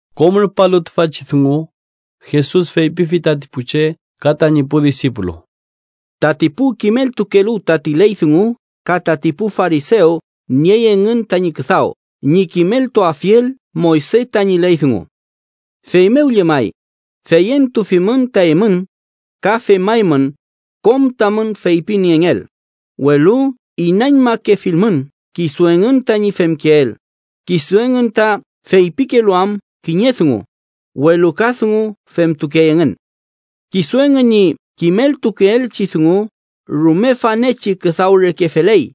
Kom rupalu tüfachi dungu, Jesus feypifi tati pu che ka tañi pu disipulu: “Tati pu kimeltukelu tati ley dungu ka tati pu farisew niey engün tañi küdaw ñi kimeltuafiel Moyse tañi ley dungu. Feymew llemay, feyentufimün ta eymün ka femaymün kom tamün feypingeel, welu inañmakefilmün kisu engün tañi femkeel, kisu engün ta feypikelu am kiñe dungu, welu ka dungu femtukey engün. Kisu engün ñi kimeltukeelchi dungu rume fanechi küdaw reke feley,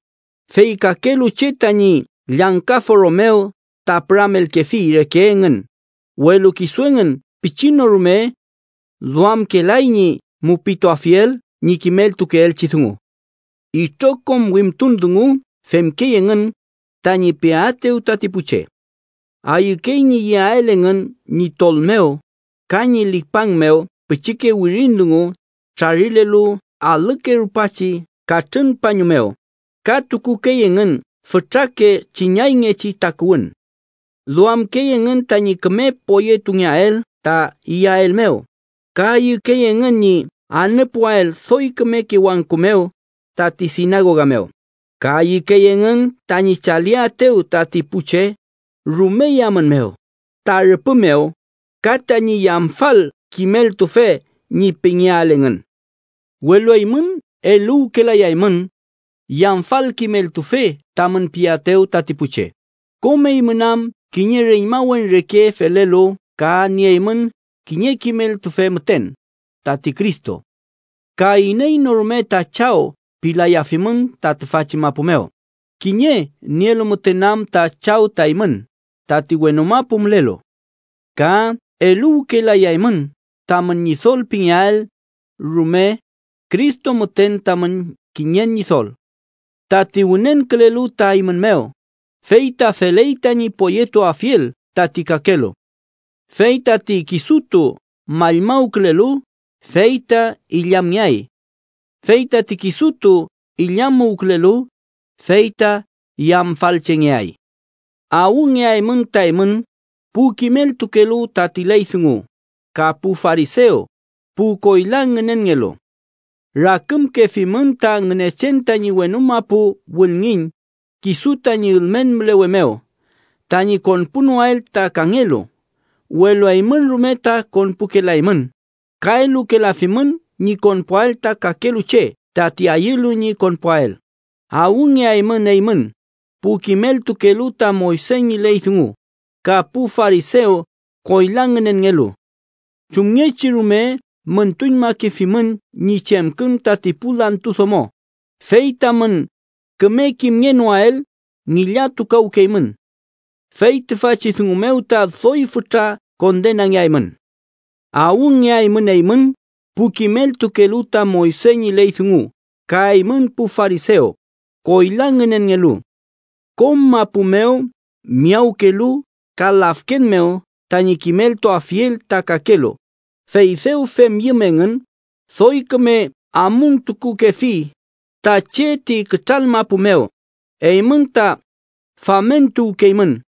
fey kakelu che tañi llangka foro mew ta püramelkefi reke engün, welu kisu engün pichi no rume duamkelay ñi mupituafiel ñi kimeltukeelchi dungu. “Itrokom wimtun dungu femkey engün tañi peaetew tati pu che. Ayükey ñi yeael engün ñi tol mew ka ñi lipang mew pichike wirin dungu trarilelu alüke rupachi katrün pañu mew, ka tukukey engün fütrake chiñayngechi takuwün. Duamkey engün tañi küme poyetungeael ta iyael mew, ka ayükey engün ñi anüpuael doy kümeke wangku mew tati sinagoga mew, ka ayükey engün tañi chaliaetew tati pu che rume yamün mew ta rüpü mew ka tañi Yamfal Kimeltufe ñi pingeael engün. “Welu eymün eluwkelayaymün Yamfal Kimeltufe tamün piaetew tati pu che, kom eymün am kiñe reñmawen reke felelu ka nieymün kiñe kimeltufe müten, tati Cristo. Ka iney no rume ta chaw pilayafimün ta tüfachi mapu mew, kiñe nielu müten am ta Chaw ta eymün: tati wenu mapu mülelu. Ka eluwkelayaymün tamün ñidol pingeael rume, Cristo müten tamün kiñen Ñidol. Tati wünenkülelu ta eymün mew, fey ta feley tañi poyetuafiel tati kakelu. Fey tati kisutu mallmawkülelu, fey ta illamngeay. Fey tati kisutu illamuwkülelu, fey ta yamfalchengeay. “¡Awngeaymün ta eymün, pu kimeltukelu tati ley dungu ka pu farisew, pu koyla ngünenngelu! Rakümkefimün ta Ngünechen tañi wenu mapu wülngiñ kisu tañi ülmen mülewe mew tañi konpunoael ta kangelu. Welu eymün rume ta konpukelaymün, ka elukelafimün ñi konpuael ta kakelu che tati ayülu ñi konpuael. “¡Awngeaymün eymün, pu kimeltukelu ta Moyse ñi ley dungu ka pu farisew koyla ngünenngelu! Chumngechi rume müntuñmakefimün ñi chemkün tati pu lantu domo, fey tamün küme kimngenoael ngillatukawkeymün. Fey tüfachi dungu mew ta doy fütra kondengeaymün. “¡Awngeaymün eymün, pu kimeltukelu ta Moyse ñi ley dungu ka eymün pu farisew, koyla ngünenngelu! Kom mapu mew miyawkelu ka lafken mew tañi kimeltuafiel ta kakelu, fey dew femyüm engün, doy küme amuntukukefi ta che ti kütral mapu mew eymün ta famentuwkeymün.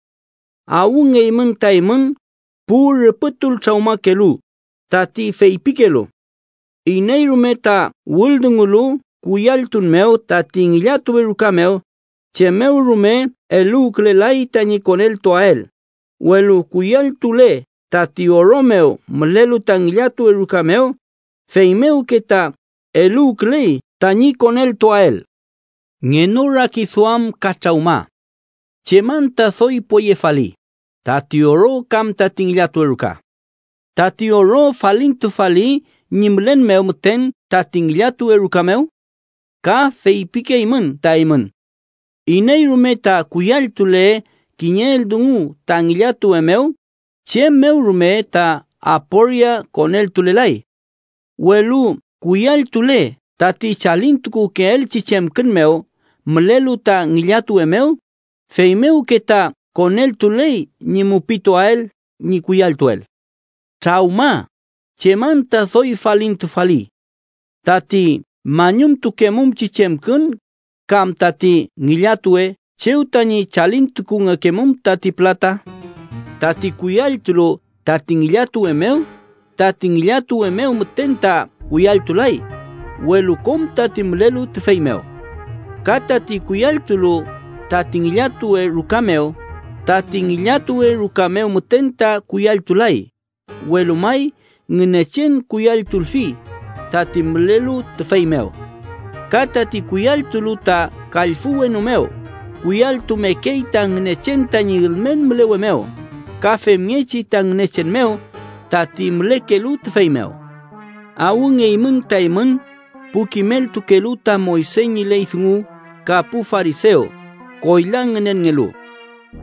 “¡Awngeymün ta eymün, pu rüpütultrawmakelu!, tati feypikelu: ‘Iney rume ta wüldungulu kuyalltun mew tati ngillatuwe ruka mew, chem mew rume eluwkelay tañi koneltuael, welu kuyalltule tati oro mew mülelu ta ngillatuwe ruka mew, feymewke ta eluwküley tañi koneltuael.’ ¡Ngenorakiduam ka trawma! ¿Chem anta doy poyefali: tati oro kam tati ngillatuwe ruka? ¿Tati oro falintufali ñi mülen mew müten tati ngillatuwe ruka mew? Ka feypikeymün ta eymün: ‘Iney rume ta kuyalltule kiñe eldungu ta ngillatun mew, chem mew rume ta aporia koneltulelay. Welu kuyalltule tati chalintukukeelchi chemkün mew mülelu ta ngillatuwe mew, feymewke ta koneltuley ñi mupituael ñi kuyalltuel.’ ¡Trawma! ¿Chem anta doy falintufali: tati mañumtukemumchi chemkün, kam tati ngillatuwe chew tañi chalintukungekemum tati pülata? Tati kuyalltulu tati ngillatuwe mew, tati ngillatuwe mew müten ta kuyalltulay, welu kom tati mülelu tüfey mew. Ka tati kuyalltulu tati ngillatuwe ruka mew, tati ngillatuwe ruka mew müten ta kuyalltulay, welu may Ngünechen kuyalltulfi, tati mülelu tüfey mew. Ka tati kuyalltulu ta kallfü wenu mew, kuyalltumekey ta Ngünechen tañi ülmen mülewe mew, ka femngechi ta Ngünechen mew, tati mülekelu tüfey mew. “¡Awngeymün ta eymün, pu kimeltukelu ta Moyse ñi ley dungu ka pu farisew, koyla ngünenngelu!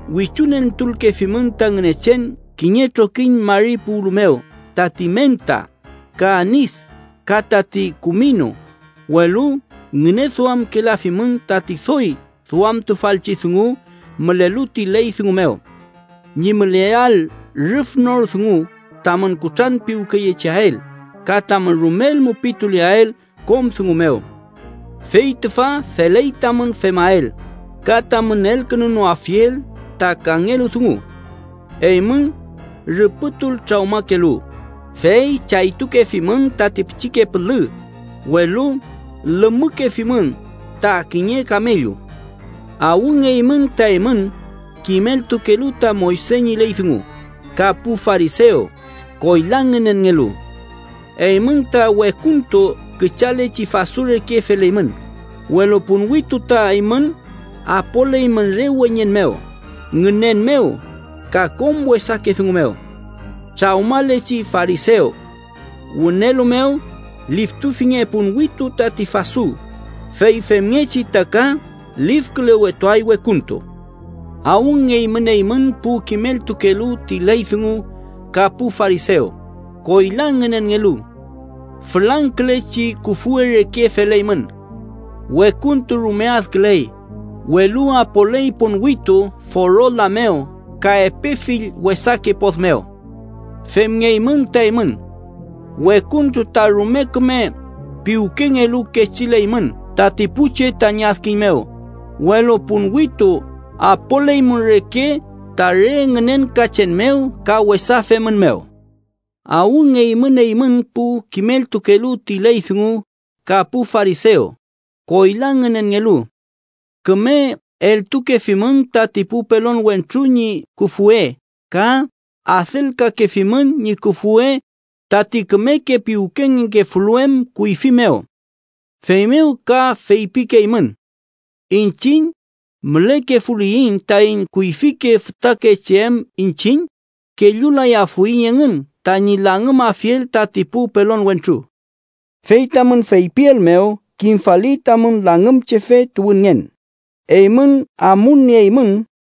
Wichuentulkefimün ta Ngünechen kiñe trokiñ mari puwlu mew tati menta, ka anis ka tati kuminu, welu ngüneduamkelafimün tati doy duamtufalchi dungu mülelu ti ley dungu mew: ñi müleael rüf nor dungu, tamün kutranpiwkeyecheael ka tamün rumel mupituleael kom dungu mew. Fey tüfa feley tamün femael, ka tamün elkünunoafiel ta kangelu dungu. ¡Eymün, rüpütultrawmakelu, fey chaytukefimün tati pichike pülü, welu lümükefimün ta kiñe kamellu! “¡Awngeymün ta eymün, kimeltukelu ta Moyse ñi ley dungu ka pu farisew, koyla ngünenngelu! Eymün ta wekuntu küchalechi fasu reke feleymün, welu ponwitu ta eymün apoleymün re weñen mew, ngünen mew, ka kom wesake dungu mew. ¡Trawmalechi farisew! Wünelu mew liftufinge ponwitu tati fasu, fey femngechi ta ka lifkülewetuay wekuntu. “¡Awngeymün eymün, pu kimeltukelu ti ley dungu ka pu farisew, koyla ngünenngelu! Fülangkülechi küfwe reke feleymün. Wekuntu rume adküley, welu apoley ponwitu foro la mew ka epe fill wesake pod mew. Femngeymün ta eymün: wekuntu ta rume küme piwkengelu kechilekeymün tati pu che ñi adkiñ mew, welu ponwitu apoleymün reke ta re ngünenkachen mew ka wesa femün mew. “¡Awngeymün eymün, pu kimeltukelu ti ley dungu ka pu farisew, koyla ngünenngelu! Küme eleltukefimün tati pu pelon wentru ñi küfwe ka adelkalkefimün ñi küfwe tati kümeke piwkengefulu em kuyfi mew. Feymew ka feypikeymün: ‘Iñchiñ mülekefuliyiñ taiñ kuyfike fütakeche em iñchiñ, kellulayafuiñ engün tañi langümafiel tati pu pelon wentru.’ Fey tamün feypiel mew, kimfali tamün langümchefe tuwünngen. ¡Eymün amulnieymün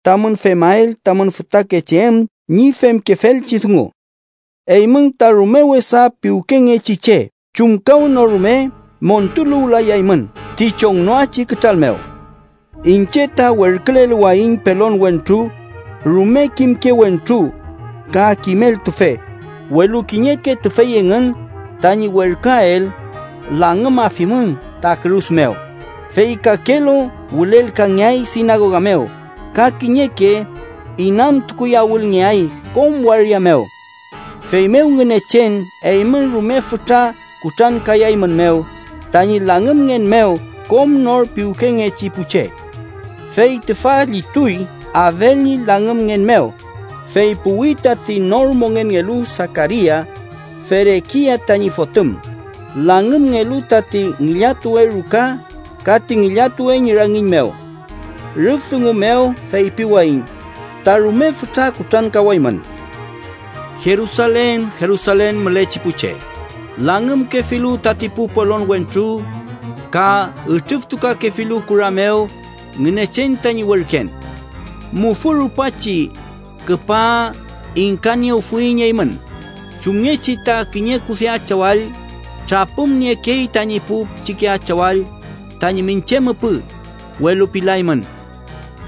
tamün femael tamün fütakeche em ñi femkefelchi dungu! “¡Eymün ta rume wesa piwkengechi che! ¡Chumkawnorume montuluwlayaymün ti chongnoachi kütral mew! Iñche ta werküleluwayiñ pelon wentru, rume kimke wentru ka kimeltufe, welu kiñeke tüfey engün tañi werküael, langümafimün ta kürus mew, fey kakelu wülelkangeay sinagoga mew ka kiñeke inantukuyawülngeay kom waria mew. Feymew Ngünechen eymün rume fütra kutrankayaeymünmew tañi langümngen mew kom nor piwkengechi pu che. Fey tüfa llituy Abel ñi langümngen mew, fey puwi tati nor mongenngelu Sakaria, Ferekia tañi fotüm, langümngelu tati ngillatuwe ruka ka ti ngillatuwe ñi rangiñ mew. Rüf dungu mew feypiwayiñ ta rume fütra kutrankawaymün. “¡Jerusalen, Jerusalen mülechi pu che, langümkefilu tati pu pelon wentru ka ütrüftukakefilu kura mew Ngünechen tañi werken! ¡Mufü rupachi küpa ingkaniewfuiñ eymün, chumngechi ta kiñe kude achawall trapümniekey tañi pu pichike achawall tañi miñche müpü, welu pilaymün!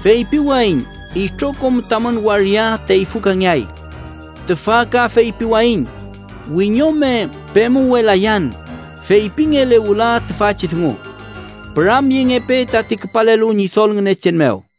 Feypiwayiñ itrokom tamün waria teyfükangeay. Tüfa ka feypiwayiñ: wiñome pemuwelayan feypingele wüla tüfachi dungu: ‘¡Püramyengepe tati küpalelu Ñidol Ngünechen mew!’”